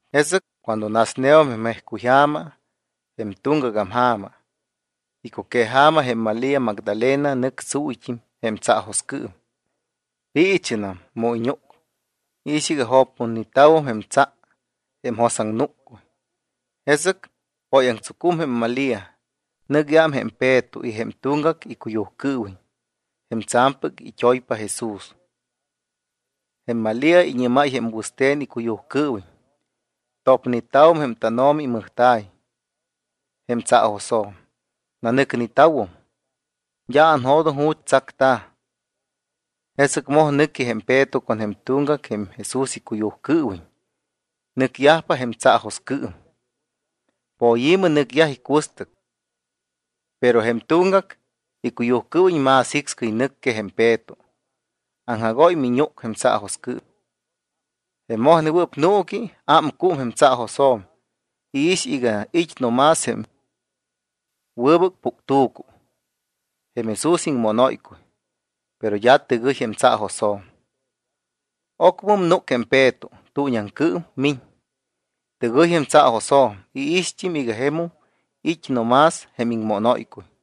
Jesɨc cuando nasneum jém jejcuyja̱ma, jém tuŋgagam ja̱ma, icuqueja̱ma, jém Malía Magdalena nɨc tsuuyt́im jém tsaajoscɨɨm. Piichɨnam. Mu iñúc, iix iga jopputneta̱wum jém tsa jém jos iŋnúccuy. Jesɨc póyaŋtsucum jém Malía, nɨc iám jém Peto y jém tuŋgac icuyujcɨɨwiñ, jém tsa̱mpɨc it́oypa Jesús. Jém Malía iñɨ́máy jém wɨste̱n icuyujcɨɨwiñ: —Topneta̱wum jém tánO̱mi imɨjta̱y jém tsaajosjo̱m, nanɨcneta̱wum. D́a anjo̱doŋ ju̱t́ tsacta̱. Jesɨc moj nɨqui jém Peto con jém tuŋgac jém Jesús icuyujcɨɨwiñ. Nɨcyajpa jém tsaajoscɨɨm. Poyi̱mɨ nɨcyaj icuɨstɨc, pero jém tuŋgac icuyujcɨɨwiñ más jicscɨy nɨc que jém Peto. Aŋjagóy miñúc jém tsaajoscɨɨm. Jém mojnewɨɨp nuuqui ámcúm jém tsaajosjo̱m. Iix iga it́ no más jém wɨbɨc puctu̱cu, jém Jesús iŋmónóycuy, pero d́a tɨgɨy jém tsaajosjo̱m. Ocmɨm núc jém Peto, tuuñiaŋcɨɨm miñ. Tɨgɨy jém tsaajosjo̱m. Iixt́im iga jemum it́ no más jém iŋmónóycuy.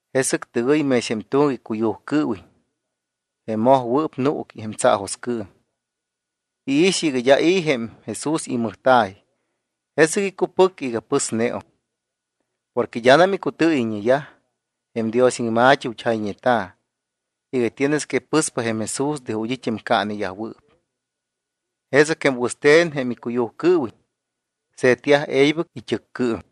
Jesɨc tɨgɨy mex jém tuŋgac icuyujcɨɨwiñ, jém mojnewɨɨp nuuqui jém tsaajoscɨɨm. Iix iga d́a i̱ jém Jesús imɨjta̱y, jesɨc icupɨc iga pɨsneum. Porque d́anam icutɨɨyɨyñeyaj jém Dios iŋma̱t́i ju̱t́ jayñeta̱ iga tienes que pɨspa jém Jesús de ju̱t́ it́ jém caaneyajwɨɨp. Jesɨc jém wɨste̱n jém icuyujcɨɨwiñ se̱tyaj e̱ybɨc it́ɨccɨɨm.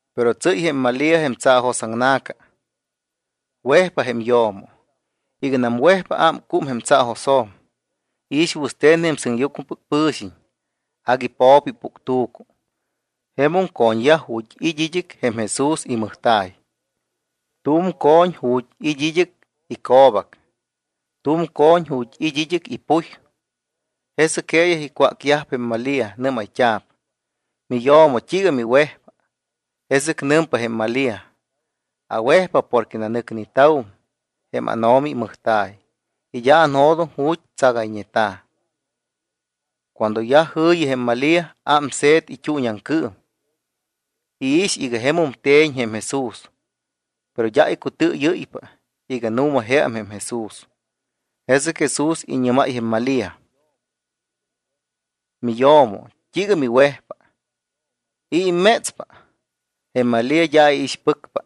Pero tsɨ́y jém Malía jém tsaajosaŋna̱ca. Wejpa jém yo̱mo. Iganam wejpa ámcúmpa jém tsaajosjo̱m. Iix wɨste̱n jém sɨŋyucmɨpɨc pɨ̱xiñ. Agui po̱po ipuctu̱cu. Jemum co̱ñyaj ju̱t́ it́ id́ɨc jém Jesús imɨjta̱y. Tu̱m co̱ñ ju̱t́ it́ id́ɨc ico̱bac, tu̱m co̱ñ ju̱t́ it́ id́ɨc ipuy. Jesɨc jeeyaj icwácyajpa jém Malía. Nɨ́mayt́a̱p: —Miyo̱mo, ¿t́iiga miwejpa? Jesɨc nɨmpa jém Malía: —Awejpa porque nanɨcneta̱wum jém ánO̱mi imɨjta̱y y d́a anjo̱doŋ ju̱t́ tsagayñeta̱. Cuando yaj jɨ̱yi jém Malía, ámse̱t it́uuñiaŋcɨɨm. Iix iga jemum te̱ñ jém Jesús. Pero d́a icutɨɨyɨ́ypa iga nu̱ma jeam jém Jesús. Jesɨc Jesús iñɨ́máy jém Malía: —Miyo̱mo, ¿t́iiga miwejpa? ¿I̱ immétspa? Jém Malía d́a iixpɨcpa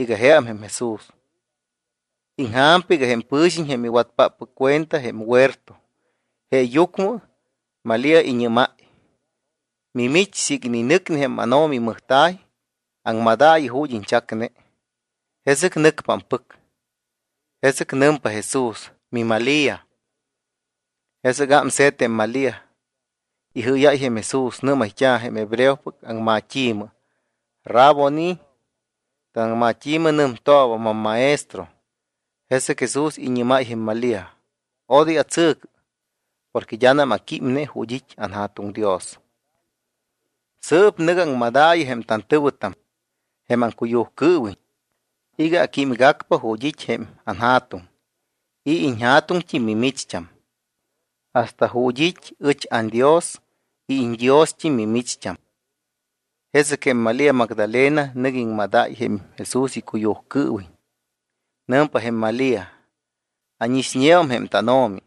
iga jeam jém Jesús, iŋja̱mpa iga je jém pɨ̱xiñ jém iwatpáppɨc cuenta jém huerto. Jeeyucmɨ Malía iñɨ́máy: —Mimich, siiga ininɨcne jém ánO̱mi imɨjta̱y, aŋmadaayɨ ju̱t́ iñchacne, jesɨc nɨcpa ampɨc. Jesɨc nɨmpa Jesús: —¡MiMalía! Jesɨc ámse̱t jém Malía. Ijɨ́yáy jém Jesús. Nɨ́mayt́a̱ jém hebreopɨc aŋmat́i̱mɨ: —¡Raboni! Tanaŋmat́i̱mɨ nɨmtooba: MamMaestro. Jesɨc Jesús iñɨ́máypa jém Malía: —Odoy atsɨ̱cɨ porque d́anam aquímne ju̱t́ it́ anJa̱tuŋ Dios. Sɨɨp nɨ̱gɨ aŋmadaayɨ jém tantɨ̱wɨtam, jém aŋcuyujcɨɨwiñ, iga aquímgacpa ju̱t́ it́ jém anJa̱tuŋ y iñJa̱tuŋt́im mimicht́am, hasta ju̱t́ it́ ɨch anDios y iñDiost́im mimicht́am. Jesɨc jém Malía Magdalena nɨc iŋmadáy jém Jesús icuyujcɨɨwiñ. Nɨmpa jém Malía: —Ánixñeum jém tánO̱mi.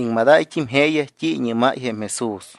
Iŋmadáyt́im jeeyaj t́i iñɨ́máy jém Jesús.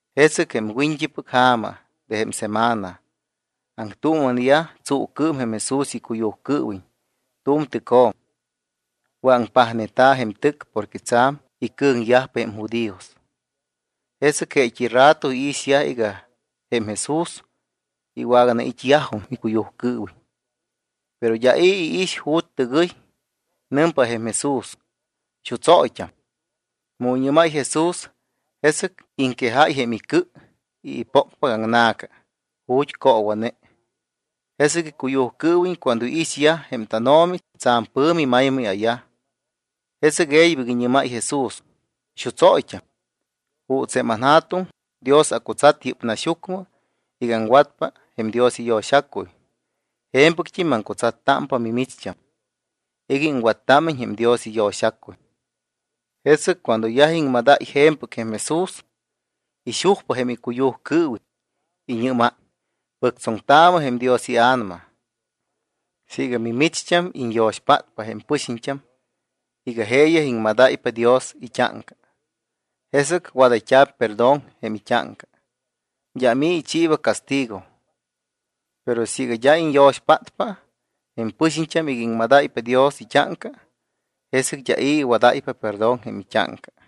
Jesɨc jém wiñt́ipɨc ja̱ma de jém semana, aŋtuuma̱neyaj tsuucɨɨm jém Jesús icuyujcɨɨwiñ tu̱m tɨcjo̱m. Wɨ̱aŋpajneta̱ jém tɨc porque tsa̱m icɨ̱ŋyajpa jém judíos. Jesɨc jeet́i rato iixyaj iga jém Jesús iwaganait́yajum icuyujcɨɨwiñ. Pero d́a i̱ iix ju̱t́ tɨgɨy. Nɨmpa jém Jesús: —¡Xutsóyt́am! Mu iñɨ́máy Jesús, jesɨc iŋquejáy jém icɨ y ipócpacaŋna̱ca ju̱t́ coowa̱ne. Jesɨc icuyujcɨɨwiñ cuando iixyaj jém tánO̱mi, tsa̱m pɨ̱mi maymayyaj. Jesɨc e̱ybɨct́im iñɨ́máy Jesús: —¡Xutsóyt́am! Juuts jém anJa̱tuŋ Dios acutsat yɨ́p naxyucmɨ iga aŋwatpa jém Dios iyo̱xacuy, je̱mpɨct́im maŋcutsattámpa mimicht́am iga iŋwattámiñ jém Dios iyo̱xacuy. Jesɨc cuando yaj iŋmadáy je̱mpɨc jém Jesús, ixujpa jém icuyujcɨɨwiñ. Iñɨ́máy: —Pɨctsoŋtaamɨ jém Dios iA̱nama. Siiga mimicht́am iñyo̱xpátpa jém pɨxiñt́am iga jeeyaj iŋmadáypa Dios it́áŋca, jesɨc wadayt́a̱p perdón jém it́áŋca. D́am i̱ ichiiba castigo. Pero siiga d́a iñyo̱xpátpa jém pɨxiñt́am iga iŋmadáypa Dios it́áŋca, jesɨc d́a i̱ iwadáypa perdón jém it́áŋca.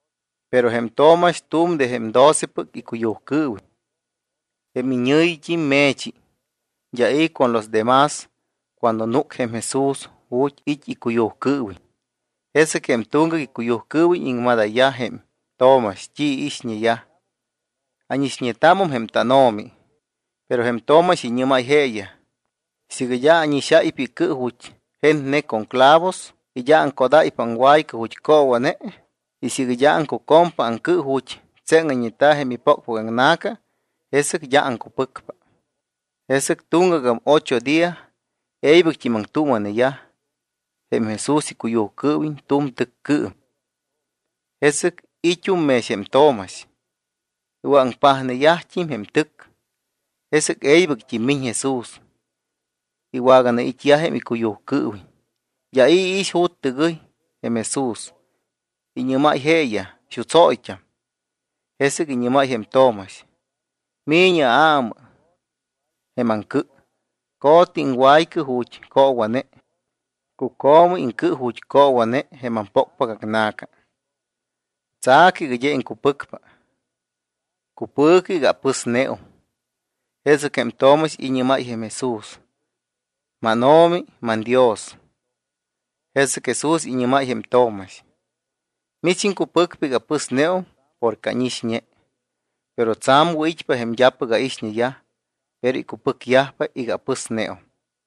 Pero jém Tomax tu̱m de jém docepɨc icuyujcɨɨwiñ, jém iñɨ̱yit́im Me̱chi, d́a i̱ con los de más cuando núc jém Jesús ju̱t́ it́ icuyujcɨɨwiñ. Jesɨc jém tuŋgac icuyujcɨɨwiñ iŋmadayyaj jém Tomax t́i iixñeyaj: —Ánixñetámum jém tánO̱mi. Pero jém Tomax iñɨ́máy jeeyaj: —Siiga d́a ánixáypa icɨ ju̱t́ jetne con jém clavos y aŋcodáypa aŋwaycɨ ju̱t́ coowa̱ne y siiga d́a aŋcucompa aŋcɨ ju̱t́ tseŋayñeta̱ jém ipócpacaŋna̱ca, jesɨc d́a aŋcupɨcpa. Jesɨc tuŋgagam ocho día e̱ybɨct́im aŋtuuma̱yaj jém Jesús icuyujcɨɨwiñ tu̱m tɨccɨɨm. Jesɨc i̱t́um mex jém Tomax. Iwɨ̱aŋpajneyajt́im jém tɨc. Jesɨc e̱ybɨct́im miñ Jesús, iwaganait́yaj jém icuyujcɨɨwiñ. D́a i̱ iix ju̱t́ tɨgɨy jém Jesús. Iñɨ́máy jeeyaj: —¡Xutsóyt́am! Jesɨc iñɨ́máy jém Tomax: —Mi̱ñɨ aámaayɨ jém aŋcɨ. Co̱tɨ iŋwaycɨ ju̱t́ coowa̱ne. Cuco̱mɨ iŋcɨ ju̱t́ coowa̱ne jém ampócpacaŋna̱ca. Tsa̱cɨ iga d́a iŋcupɨcpa. Cupɨ̱cɨ iga apɨsneum. Jesɨc jém Tomax iñɨ́máy jém Jesús: —¡MánO̱mi, manDios! Jesɨc Jesús iñɨ́máy jém Tomax: —Mich iŋcupɨcpa iga apɨsneum porque ánixñe. Pero tsa̱m wɨ̱it́pa jém d́apɨc ánixñeyaj, pero icupɨcyajpa iga apɨsneum.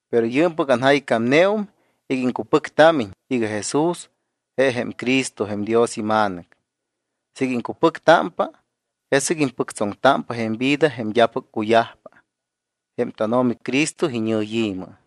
Pero yɨɨmpɨc anjaycámneum iga iŋcupɨctámiñ iga Jesús je jém Cristo jém Dios iMa̱nɨc. Siiga iŋcupɨctámpa, jesɨc impɨctsoŋtámpa jém vida jém d́apɨc cuyajpa jém tánO̱mi Cristo iñɨyi̱mɨ.